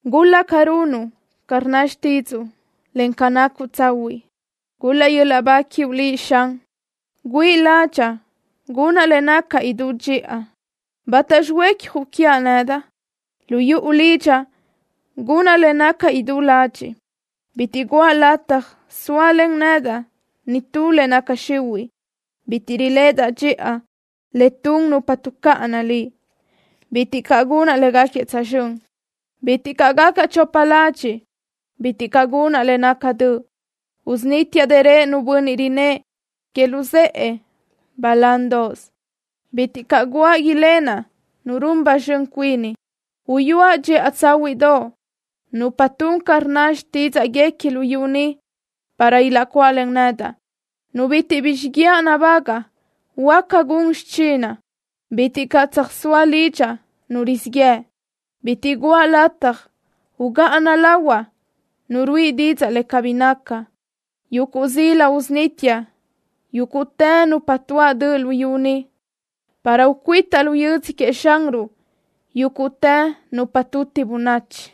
¡Gul-laʼ ca runuʼ ca rnna xtídzuʼu, en ca nacuʼ tsahuiʼ! ¡Gul-laʼ yöl-laʼ ba quiuʼ Liʼ, Xan! Güíʼi ládxaʼa gunaʼ le naca idú dxiʼa. ¿Bátaxi huécjuʼ quiaʼ nedaʼ? Lu yuʼu lidxaʼ gunaʼ le naca idú ladxiʼ. Bitiʼ guʼa lataj sóalen nedaʼ nitú le naca xihuiʼ. Bitiʼ riléʼedaʼ dxiʼa le tun nupa tuʼcáʼana Liʼ. Bitiʼ caʼ gunaʼ léguequi tsözxö́n. Bitiʼ caʼ gacaʼ chopa ladxiʼ. Bitiʼ caʼ gunaʼ le naca döʼ. Usunítiaʼ dërö nu bönniʼ rinnë́ʼ que luzë́ʼë balándoʼos. Bitiʼ caʼ guáʼ ilenaʼ nu run ba zxön cuini. Uyúaʼ dxiʼa tsáhuiʼdoʼ nupa tun ca rnna xtídzaʼguequi luyú ni, para ilaʼcuáʼlen nedaʼ. Nu bitiʼ bi xiguiaʼ nabagaʼ huáca gun xichinaʼ. Bitiʼ caʼ tsöjsóa lidxaʼ nu rizíʼ yëʼ. Bitiʼ guʼa lataj ugáʼana lahuaʼ nu ruíʼi didzaʼ le cabí naca. Yuguʼ zila usunítiaʼ yúguʼtë nupa tuáʼ döʼ luyú ni, para ucuitaʼ lu yödzö queëʼ Xanruʼ yúguʼtë nupa tuti bönachi.